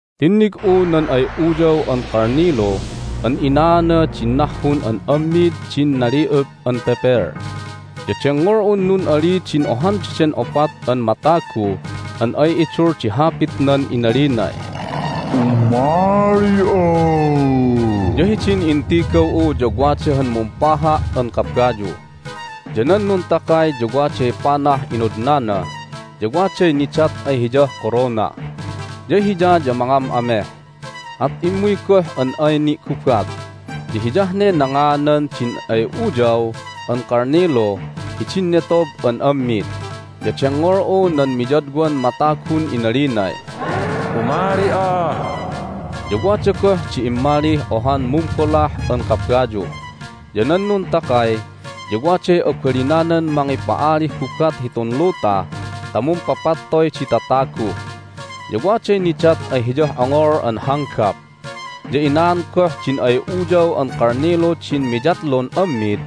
Tinnig'u nan ay Uyaw an Kalnilu an inaana din nahhun an ammid din nali'up an pepel. Ya dengngol'un nun'aliy din ohan daden opat an matagu an ay idul di hapitnan inalinay, "Umali'a!" Ya hidin intigaw'u ya wada han mumpaha' an kabayu. Ya nan nuntakay ya waday panah inodnana, ya waday nidat ay hiyah korona. Ya hiya ya mangam'ameh, at immuy goh an ay ni'gubat. Ya hiyah ne nangaanan din ay Uyaw an Kalnilu hidin netob an ammid. Ya dengngol'u nan miyadwan matagun inalinay, "Umali'a!" Ya wada goh di immalih ohan mumbolah an kabayu. Ya nan nuntakay ya waday abalinanan mangipa'alih gubat hitun luta ta mumpapattoy di tatagu. Ya waday nidat ay hiyah ongol an hanggap. Ya inaan goh din ay Uyaw an Kalnilu din miyatlun ammid.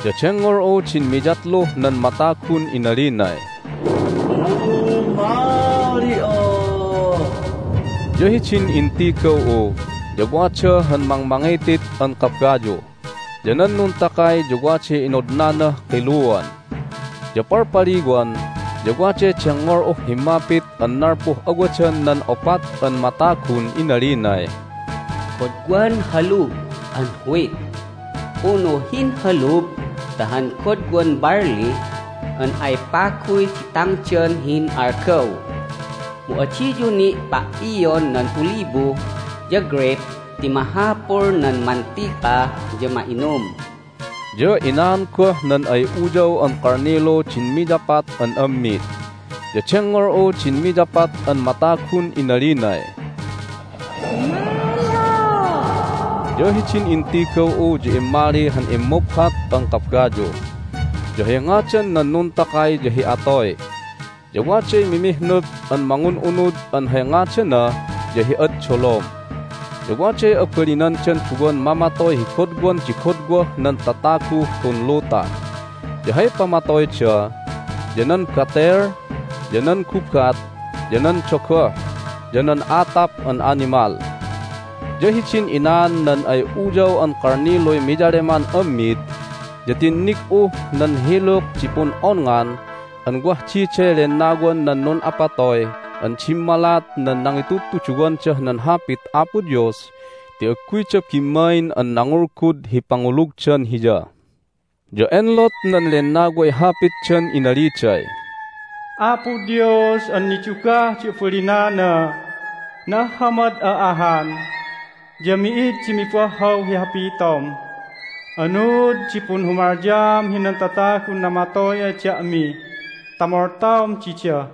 Ya dengngol'u din miyatluh nan matagun inalinay, "Umali'a!" Ya hidin intigaw'u ya wada han mangmangitit an kabayu. Ya nan nuntakay ya waday inodnanah kiluan. Ya palpaliwan ya waday dengngol'uh himmapit an nalpuh awadan nan opat an matagun inalinay, "Godwan halub an wheat unu hinhalub ta han godwan barle an ay paguy di tangdan hi hin'algaw! Mu adiyu ni' pa"ion nan olibo ya greyp ti mahapul nan mantika ya ma'inum!" Ya inaan goh nan ay Uyaw an Kalnilu din miyapat an ammid. Ya dengngol'u din miyapat an matagun inalinay, "Umali'a!" Ya hidin intigaw'u ya immali han immuphat an kabayu. Ya hay ngadan nan nuntakay ya hi Atoy. Ya waday mimihnup an mangun'unud an hay ngadana ya hi Ad Dolom. Ya waday abalinandan duwan mamatoy hi godwan di godwah nan tataguh tun luta. Ya hay pamatoyda ya nan batel, ya nan gubat, ya nan dogoh, ya nan atap an animal. Ya hidin inaan nan ay Uyaw an Kalniluy miyaleman ammid ya tinnig'uh nan hiluk di pun'onngan an wah diday lennawan nan nun'apatoy an dimmalat nan nangitudtuduwandah nan Hapit Apo Dios ti agguyda bimmain an nangulgud hi pangulugdan Hiya. Ya enlot nan lennaway hapitdan inaliday, "Apo Dios an nidugah di abalinana, na'ahhamad'a ahan, ya mi'id di mibahhaw hi hapitom! Anuud di punhumalyaam hinan tatagun namatoy ay da'mi ta moltaom dida?"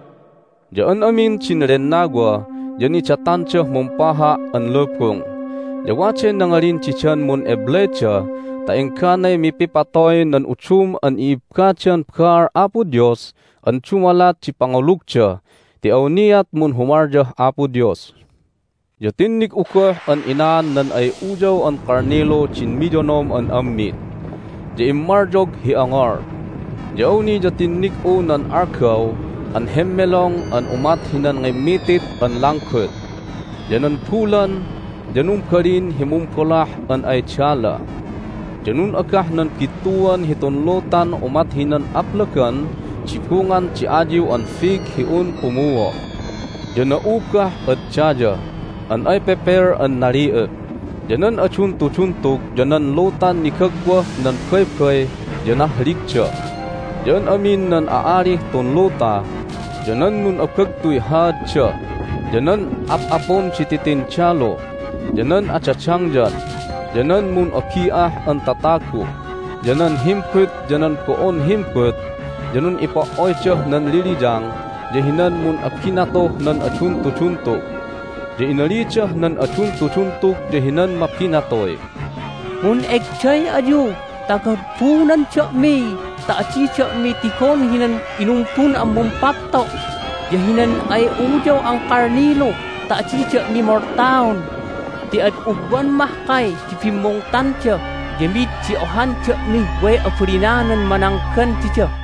Ya an amin din lennawa ya nidatandah mumpaha' an lubung. Ya waday nangalin didan mun'eblayda ta engganay mipipatoy nan udum an i'ibbadan baal Apo Dios an dumalat di pangulugda ti awniat munhumalyah Apo Dios. Ya tinnig'u goh an inaan nan ay Uyaw an Kalnilu din miyonom an ammid, ya immalyog hi ongol. Ya awni ya tinnig'u nan algaw an hemmelong an umat hinan ngimmitit an langgut. Ya nan bulan ya numbalin hi mumbolah an ay dala. Ya nun'agah nan bittuan hitun lutan umat hinan aplagan di bungan di ayiw an fig hi un pumuo'. Ya na'ubah ad daya an ay pepel an nali'up. Ya nan aduntuduntug ya nan lutan nigagwah nan baybay ya nahligda. Ya an amin nan a'alih tun luta, ya nan nun'abagtuy haadda, ya nan ap'apun di titindalu, ya nan adadangyan, ya nan mun'abi'ah an tatagu, ya nan himbut, ya nan bo'on himbut ya nun'ipo"oydah nan liliyang ya hinan mun'abinatuh nan aduntuduntug. Ya inalidah nan aduntuduntug ya hinan mabinatuy, "Mun'egday ayu ta gabunan da'mi ta adi da'mi tigon hinan inumbun an Mumpapto' ya hinan ay Uyaw an Kalnilu ta adi da'mi moltaon! Ti ad ugwan mahkay di bimmungtanda, ya mi'id di ohan da'mih way abalinanan mananggan dida!"